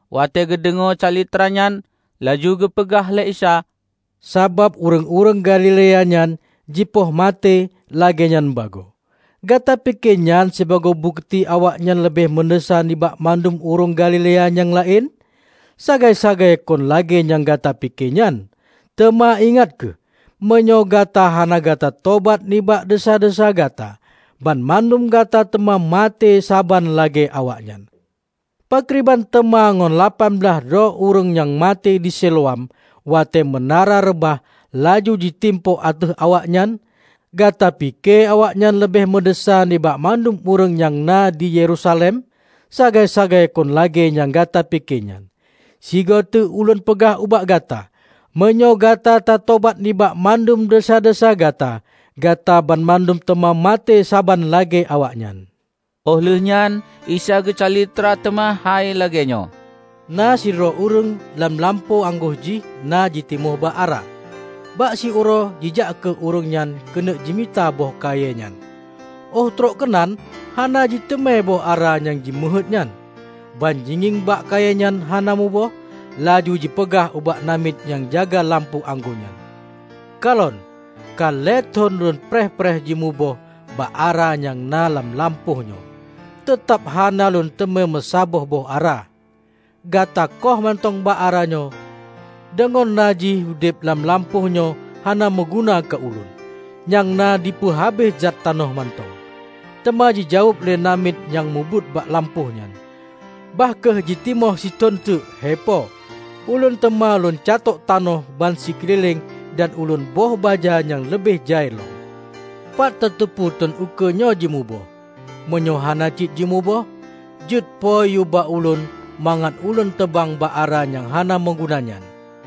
Watée geudeungoe calitranyan, laju geupeugah lé Isa, "Sabab ureuëng-ureuëng Galilea nyan jipoh maté lagée nyan bagoe, gata pike nyan sibagoe bukeuti awaknyan leubeh meudesya nibak mandum ureuëng Galilea nyang laén? Sagai-sagai kon lagée nyang gata pike nyan! Teuma ingat kheueh: Meunyoe gata hana gata tobat nibak desya-desya gata, banmandum gata teuma maté saban lagée awaknyan. Pakriban teuma ngon lapan blaih droe ureuëng nyang maté di Siloam, watée meunara reubah laju jitimpok ateueh awaknyan? Gata pike awaknyan leubeh meudesya nibak mandum ureuëng nyang na di Yerusalem? Sagai-sagai kon lagée nyang gata pike nyan! Sigoe teuk Ulôn peugah ubak gata: Meunyoe gata tatobat nibak mandum desya-desya gata, gata banmandum teuma maté saban lagée awaknyan." Óh lheueh nyan Isa geucalitra teuma hai lagée nyoe, "Na sidroe ureuëng lam lampôh anggô jih na jitimoh bak ara. Bak siuroe jijak kheueh ureuëng nyan keuneuk jimita boh kayée nyan, óh trok keunan hana jiteumé boh ara nyang jimeuheuét nyan. Ban jingieng bak kayée nyan hana muboh, laju jipeugah ubak namiet nyang jaga lampôh anggô nyan, 'Kalon, ka lhée thon ulôn preh-preh jimuboh bak ara nyang na lam lampôh nyoe, teutab hana lôn teumé meusaboh boh ara. Gata kôh mantong bak ara nyoe! Deungon na jih udeb lam lampôh nyoe hana meuguna keu ulôn, nyang na jipeu habéh zat tanoh mantong!' Teuma jijaweueb lé namiet nyang meubuet bak lampôh nyan, 'Bah kheueh jitimoh sithon teuk, hei Po. Ulôn teuma lôn catôk tanoh bansikeulileng dan ulôn boh baja nyang leubeh jai lom. Pat tateupeue thon ukeue nyoe jimuboh. Meunyoe hana cit jimuboh, jeuet Po yue bak ulôn mangat ulôn teubang bak ara nyang hana meuguna nyan.' "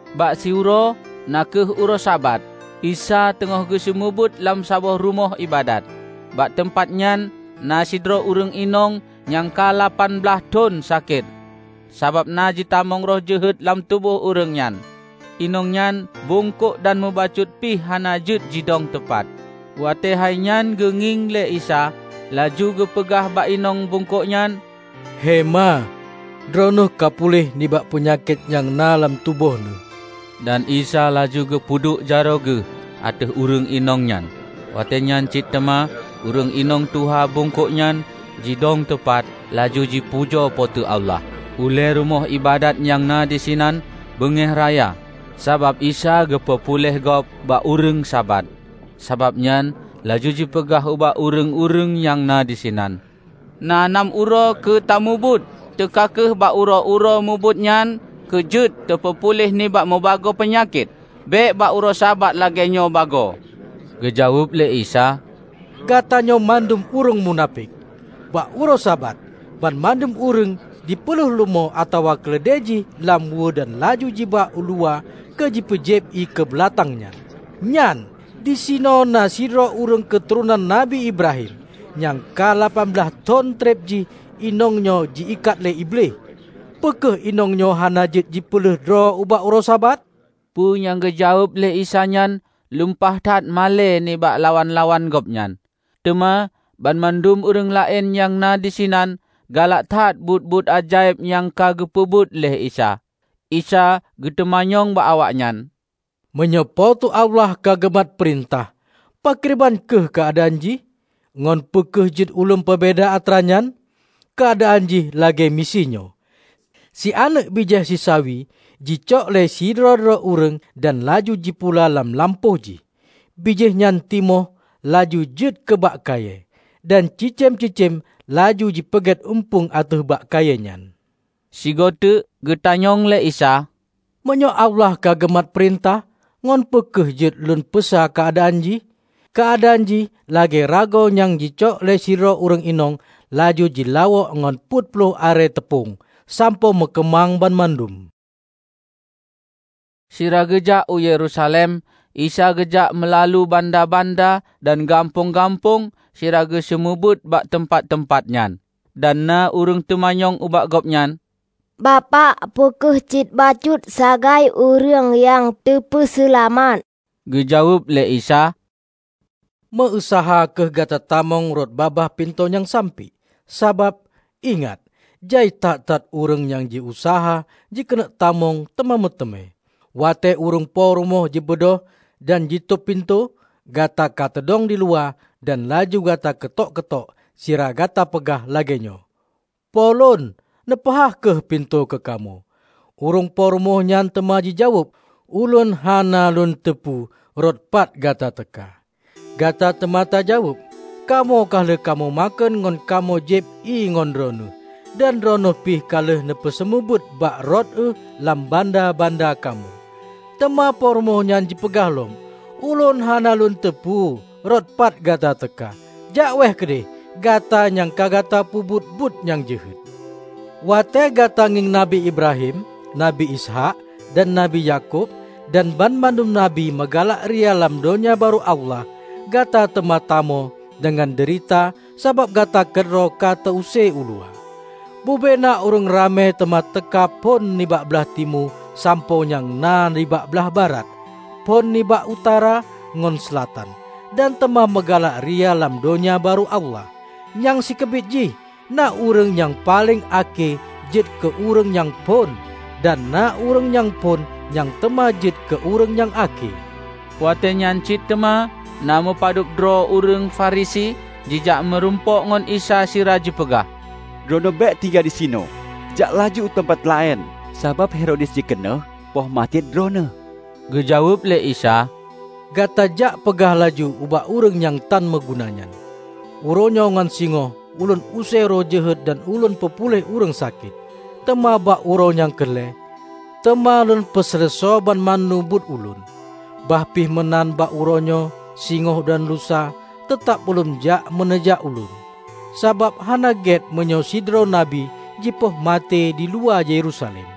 Bak siuroe na kheueh uroe Sabat, Isa teungoh geuseumeubeuet lam saboh rumoh iébadat. Bak teumpat nyan na sidroe ureuëng inong nyang ka lapan blaih thon sakét, sabab na jitamong roh jeuhet lam tuboh ureuëng nyan. Inong nyan bungkôk dan mubacut pih hana jeuet jidong tupat. Watée hainyan geungieng lé Isa, laju geupeugah bak inong bungkôk nyan, "Hei Ma, droeneueh ka puléh nibak peunyakét nyang na lam tuboh neueh!" Dan Isa laju geupeuduek jaroe Geuh ateueh ureuëng inong nyan, watée nyan cit teuma ureuëng inong tuha bungkôk nyan ka jeuet jidong tupat laju jipujoe Po teu Allah. Ulée rumoh iébadat nyang na disinan beungéh raya, sabab Isa geupeu puléh gob bak ureuëng Sabat, sabab nyan laju jipeugah ubak ureuëng-ureuëng nyang na disinan, "Na nam uroe keu tamubuet; teuka kheueh bak uroe-uroe mubuet nyan keu jeuet teupeupuléh nibak mubagoe peunyakét, bék bak uroe Sabat lagée nyoe bagoe!" Geujaweueb lé Isa, "Gata nyoe mandum ureuëng munafék! Bak uroe Sabat banmandum ureuëng jipeuleueh leumô atawa keuleudée jih lam weue dan laju jiba uluwa keu jipeujieb ié keu beulatang nyan. Nyan, disinoe na sidroe ureuëng keuturonan Nabi Ibrahim, nyang ka lapan blaih thon treb jih inong nyoe ji-ikat lé Iblih. Peu kheueh inong nyoe hana jeuet jipeuleueh droe bak uroe Sabat?" Peu nyang geujaweueb lé Isa nyan lumpah that malée nibak lawan-lawan Gobnyan; teuma banmandum ureuëng laén nyang na disinan galak that buet-buet ajaéb nyang ka geupeubuet lé Isa Isa geuteumanyong bak awaknyan, "Meunyoe Po teu Allah ka geumat peurintah, pakriban kheueh keuadaan jih? Ngon peu kheueh jeuet ulôn peubeda atra nyan? Keuadaan jih lagée miseue nyoe. Si aneuëk bijéh sisawi jicok lé sidroe-droe ureuëng dan laju jipula lam lampôh jih. Bijéh nyan timoh laju jeuet keu bak kayée, dan cicém-cicém laju jipeugét eumpung ateueh bak kayée nyan." Sigoe teuk geutanyong lé Isa, "Meunyoe Allah kageumat peurintah, ngon peu kheueh jeuet lôn peusa keuadaan jih? Keuadaan jih lagée ragoe nyang jicok lé sidroe ureuëng inong laju jilawôk ngon peuet ploh arée teupông, sampoe meukeumang banmandum." Sira geujak u Yerusalem, Isa geujak meulalu banda-banda dan gampông-gampông sira geuseumeubeuet bak teumpat-teumpat nyan. Dan na ureuëng teumanyong ubak Gobnyan, "Bapak, Peu kheueh cit bacut sagai ureuëng nyang teupeuseulamat?" Geujaweueb lé Isa, "Meu-useuha kheueh gata tamong rot babah pintoe nyang sampiek. Sabab, ingat! Jai that-that ureuëng nyang ji useuha jikeuneuk tamong teuma meuteumé. Watée ureuëng po rumoh jibeudôh dan jitôb pintoe, gata kateudong diluwa dan laju gata keutok-keutok sira gata peugah lagée nyoe, 'Po lôn, neupeuhah kheueh pintoe keukamoe!' Ureuëng po rumoh nyan teuma jijaweueb, 'Ulôn hana lôn teupeu rot pat gata teuka!' Gata teuma tajaweueb, 'Kamoe ka lheueh kamoe makheun ngon kamoe jieb ié ngon Droeneueh, dan Droeneueh pih ka lheueh neuseumeubeuet bak rot euh lam banda-banda kamoe!' Teuma Po rumoh nyan jipeugah lom, 'Ulôn hana lôn teupeu rot pat gata teuka. Jak wéeh keudeh, gata nyang ka gata peubuet buet nyang jeuhet!' Watée gata ngieng Nabi Ibrahim Nabi Ishaq dan Nabi Yakub dan banmandum nabi meugalak ria lam Donya Barô Allah, gata teuma tamo deungon deurita sabab gata keudroe ka teu-use uluwa! Bube na ureuëng ramé teuma teuka phon nibak blaih timu sampoe nyang na nibak blaih barat, phon nibak utara ngon seulatan, dan teuma meugalak ria lam Donya Barô Allah. Nyang sikeubit jih, na ureuëng nyang paleng akhé jeuet keu ureuëng nyang phon, dan na ureuëng nyang phon nyang teuma jeuet keu ureuëng nyang akhé." Watée nyan cit teuma, na meupadub droe ureuëng Farisi jijak meurumpok ngon Isa sira jipeugah, "Droeneueh bék tinggai disinoe! Jak laju uteumpat laén, sabab Herodes jikeuneuk poh maté droeneueh." Geujaweueb lé Isa, "Gata jak peugah laju ubak ureuëng nyang tan meuguna nyan, 'Uroe nyoe ngon singoh Ulôn use roh jeuhet dan Lôn peupuléh ureuëng sakét, teuma bak uroe nyang keu lhée, teuma Lôn peuseuleusoe banmandum buet Ulôn.' Bah pih meunan bak uroe nyoe singoh dan lusa teutab Ulôn jak meuneujak Ulôn, sabab hana gét meunyoe sidroe nabi jipoh maté diluwa Yerusalem.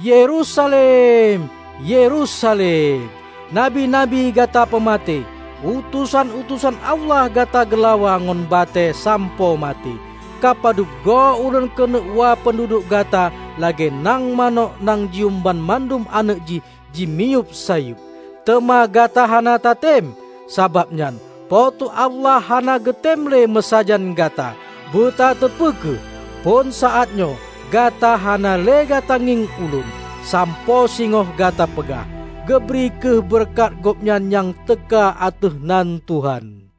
Yerusalem, Yerusalem! Nabi-nabi gata peumaté! Utosan-utosan Allah gata geulawa ngon batée sampoe maté! Ka padub goe ulôn keuneuk wa peunduduek gata lagée nang manök nyang jiuem banmandum aneuëk jih dimiyueb sayeueb, teuma gata hana tatem! Sabab nyan Po teu Allah hana geutem le meusajan gata. Butateupeue kheueh, phon saát nyoe gata hana le gata ngieng Ulôn, sampoe singoh gata peugah, 'Geubri kheueh beureukat Gobnyan nyang teuka ateueh nan Tuhan.' "